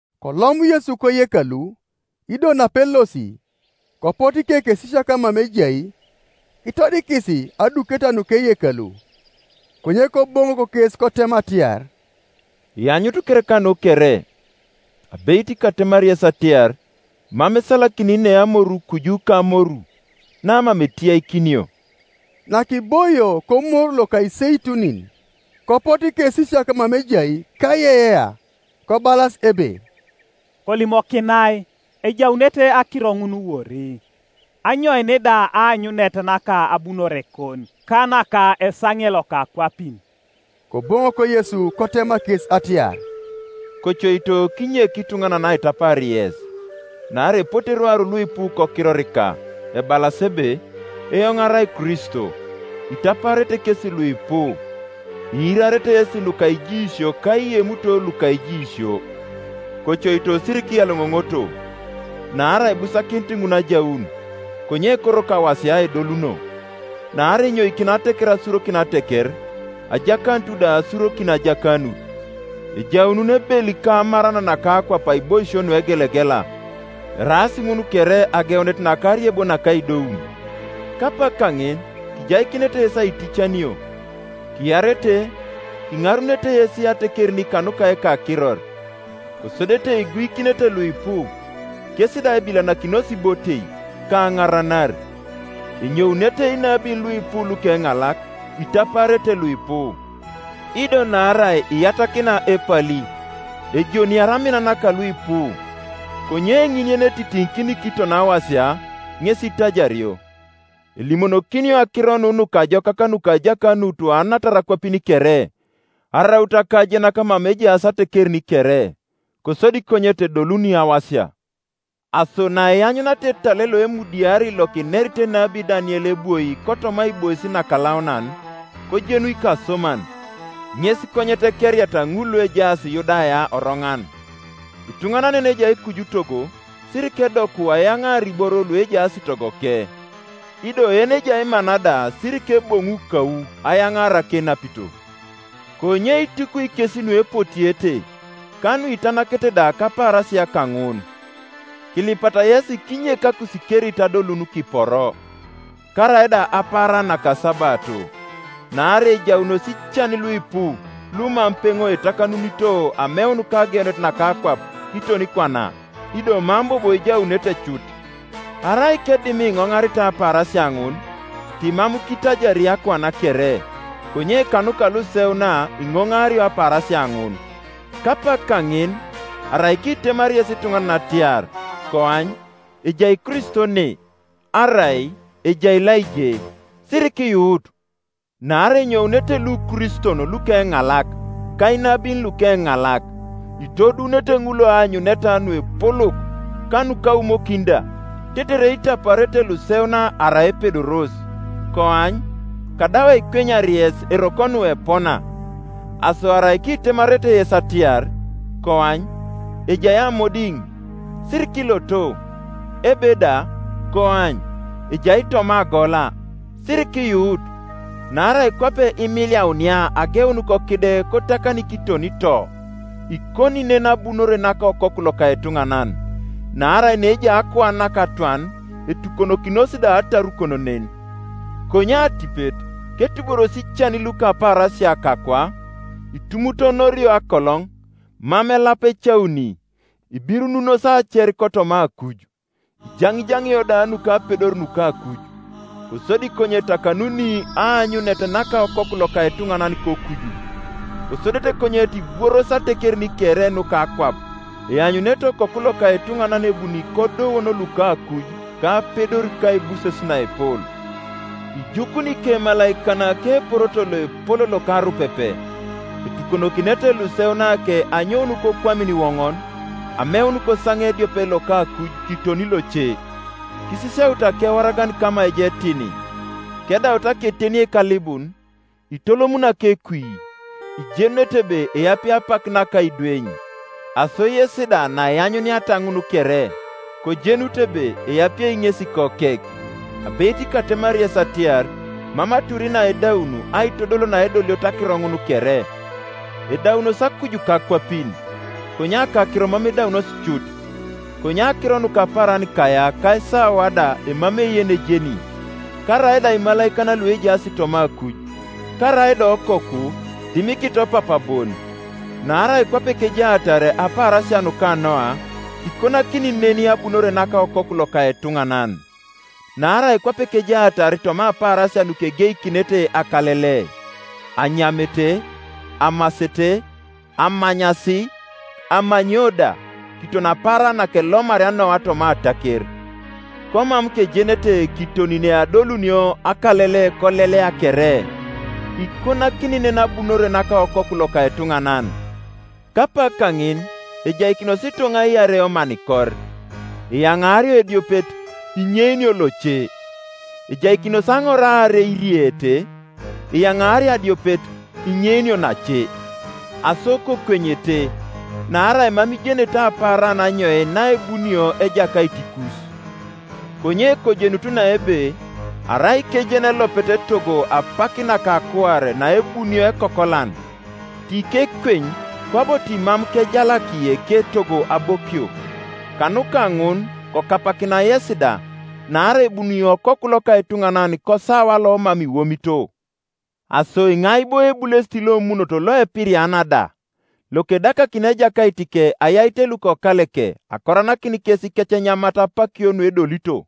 Kolom Yesu koyekalu, ido napelosi, kopotu ikekesisiak mama ejai, kitodikis aduketa nuka eyekalu. Konye Koboŋok kes kotema atiar, “Ianyut kereka nu kere? Abeit katemari yes atiar, mam esalakini ne amoru kuju kamoru, namam etiyakinio.” Nakiboio koMoru loka Iseitunin, kopotu ikesisiak mama ejai kaiyeiyea, kobalas ebe, “Kolimokinai, ejaunete akiro ŋun wori, anyoin da aanyunet naka abunorekon, ka naka esaŋe loka akwapin?” Koboŋok Yesu kotema kes atiar, “Kocoito kinyek ituŋanan aitapaar yes. Naarai epote rwaru luipu kokirorika, ebalas ebe, ‘Eoŋ arai Kristo,’ itapaarete kesi luipu. Iirarete yesi nuka ijiisio ka iemuto luka ijiisio; kocoito sirikiyaloŋoŋoto; naarai ibusakinit ŋun ajaun, konye koroko awasia edoluno. Naarai enyoikini ateker asurokin ateker, ajakanut da asurokin ajakanut, ejaunun ebel ka amaran naka akwap aiboisio nuegelegela; eraas ŋun kere ageunet naka ariebo naka aidoun. “Kapak kaŋin kijaikinete yes aiticanio, kiarete; kiŋarunete yes atekerin kanuka ekakiror. Kosodete iguikinete luipu, kes da ebilanakinos ibotei, ka aŋaranar. Enyounete inabin luipu lukeŋalak, itapaarete luipu. Ido naarai iyatakina epali, ejoniari amin naka luipu. Konye ŋin yenetitiŋikini kiton awasia, ŋes itajario. Elimonokinio Akiro nu Nukajokak nuka ajakanut anatar akwapin kere, araut akajenak mama ejaas atekerin kere; kosodi konyet edoluni awasia. “Aso naianyuniata etal loemudiari lokinerit enabi Daniel ebwoi kotoma aibois nakalaunan (kojenu ikasoman), ŋes konyet ekeriata ŋul luejaas Yudaya oroŋan; ituŋanan yenejai kuju togo sirikedoku ayaŋaar iboro luejaas togoke; ido yenejai mana da sirikeboŋu kau ayaŋaar akenapito. Konye itukwi kes nuepotiete, ka nuitanakete da kapaarasia kaŋun! Kilipata yesi kinyek akusikerit adolun kiporo, karaida apaaran naka asabato: naarai ejaunos ican luipu, lumam peŋo etakanunito ameun kageunet naka akwap kiton kwana, ido mam bobo ejaunete cut. Arai kedim iŋoŋaritai apaarasia ŋun, timam kitajari akuan kere; konye kanuka luseuna iŋoŋario apaarasia ŋun. Kapak kaŋin arai kitemari yes ituŋanan atiar, ‘Koany, ejai Kristo ne,’ arai, ‘Ejai laije’, sirikiyuut. Naarai enyounete lukriston lukeŋalak, ka inabin lukeŋalak, itoduunete ŋul aanyuneta nuepolok, ka nukaumokin da; tetere itapaarete luseuna arai epedoros. Koany, kadau aikwenyar yes eroko nu epona. Aso arai kitemarete yes atiar, ‘Koany, ejai amodiŋ’; sirikiloto. Ebe da, ‘Koany, ejai toma agola’ sirikiyuut. Naarai kwape imiliaunia ageun kokide kotakani kiton to; ikoni nen abunore naka Okoku loka etuŋanan. Naarai neejai akuan nakatwan, etukonokinos da atarukon nen. “Konye atipet, ketuboros ican luka apaarasia kakwa, itumutonorio akoloŋ, mam elap ecauni, ibirununos aacer kotoma akuj, iianiianio da nukapedor nuka akuj; kosodi konyet etakanuni aanyunet naka Okoku loka etuŋanan kokuju; kosodete konyet ibworos atekerin kere nuka akwap, eanyunete Okoku loka etuŋanan ebuni kodouon luka akuj kapedor ka aibuses naepol. Ijukuni ikemalaikan keporoto loepol loka arupepe, etukonokinete luseunake anyoun kokwamin iwoŋon, ameun kosaŋe ediopet loka akuj kiton loce. “Kisisiautu akewaragan kama ejai etini; kedaut aketenieik alibun, itolomuni akekui, ijenunete ebe eapie apak naka aidweny; aso yes da naianyuniata ŋun kere, kojenut ebe eapie ŋesi, kokek, Abeit katemari yes atiar, mam atur na edaun aitodol naedolioto akiro ŋun kere. Edaunos akuj ka akwapin, konye akakiro mam edaunos cut. “Konye akiro nuka apaaran kaya ka esawa da emamei yenejeni, karaida imalaikan luejaas toma akuj, karaida Okoku, dimikito Papa bon. Naarai kwape kejaatar apaarasia nuka Noa, ikonakini nen abunore naka Okoku loka etuŋanan. Naarai kwape kejaatar toma apaarasia nukegeikinete akalele, anyamete, amasete, amanyasi, amanyio da, kiton apaaran nakelomaria Noa toma ataker, komam kejenete kiton neadolunio akalele kolelea kere, ikonakini nen abunore naka Okoku loka etuŋanan. Kapak kaŋin ejaikinos ituŋa iarei omanikor; eyaŋaario ediopet, inyeinio loce. Ejaikinos aŋor aarei iriete; eyaŋaario adiopet, inyeinio nace. Aso kokwenyete; naarai mam ijenete apaaran anyoin naebunio Ejakait ikus. Konye kojenutu na ebe, arai kejeni elopet etogo apak naka akuare naebunio ekokolan, tikekweny, kwabo timam kejalaki eketogo abokio. Kanuka ŋun kokapakina yesi da; naarai ebuni Okoku loka etuŋanan kosawa lomam iwomito. “Aso iŋai bo ebulesit lomunot loepiriana da, lokedakakini ejakaitike ayait lukokaleke akoranakin kes ikecenyamat apakio nuedolito?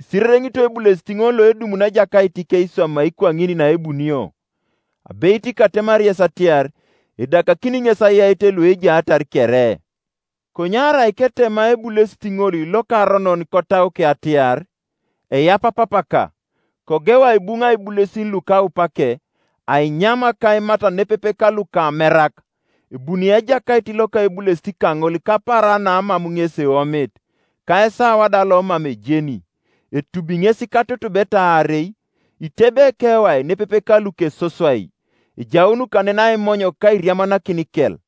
Isirereŋitoi ebulesit ŋol loedumuni ejakaitike iswamai kwaŋin naebunio. Abeit katemari yes atiar, Edakakini ŋes ayait luejaatar kere. Konye arai ketema ebulesit ŋol lokaronon kotauke atiar, ‘Eyapa papaka,’ kogeu aibuŋa ibulesin lukaupake, ainyam ka aimat nepepe kalukamerak, ebuni ejakait loka ebulesit kaŋol kapaaran namam ŋes eomit, ka esawa da lomam ejeni, etubi ŋes katutubeta aarei, itebei ekewai nepepe ka lukesoswai; ejaun kanen aimony ka airiamanakin ikel.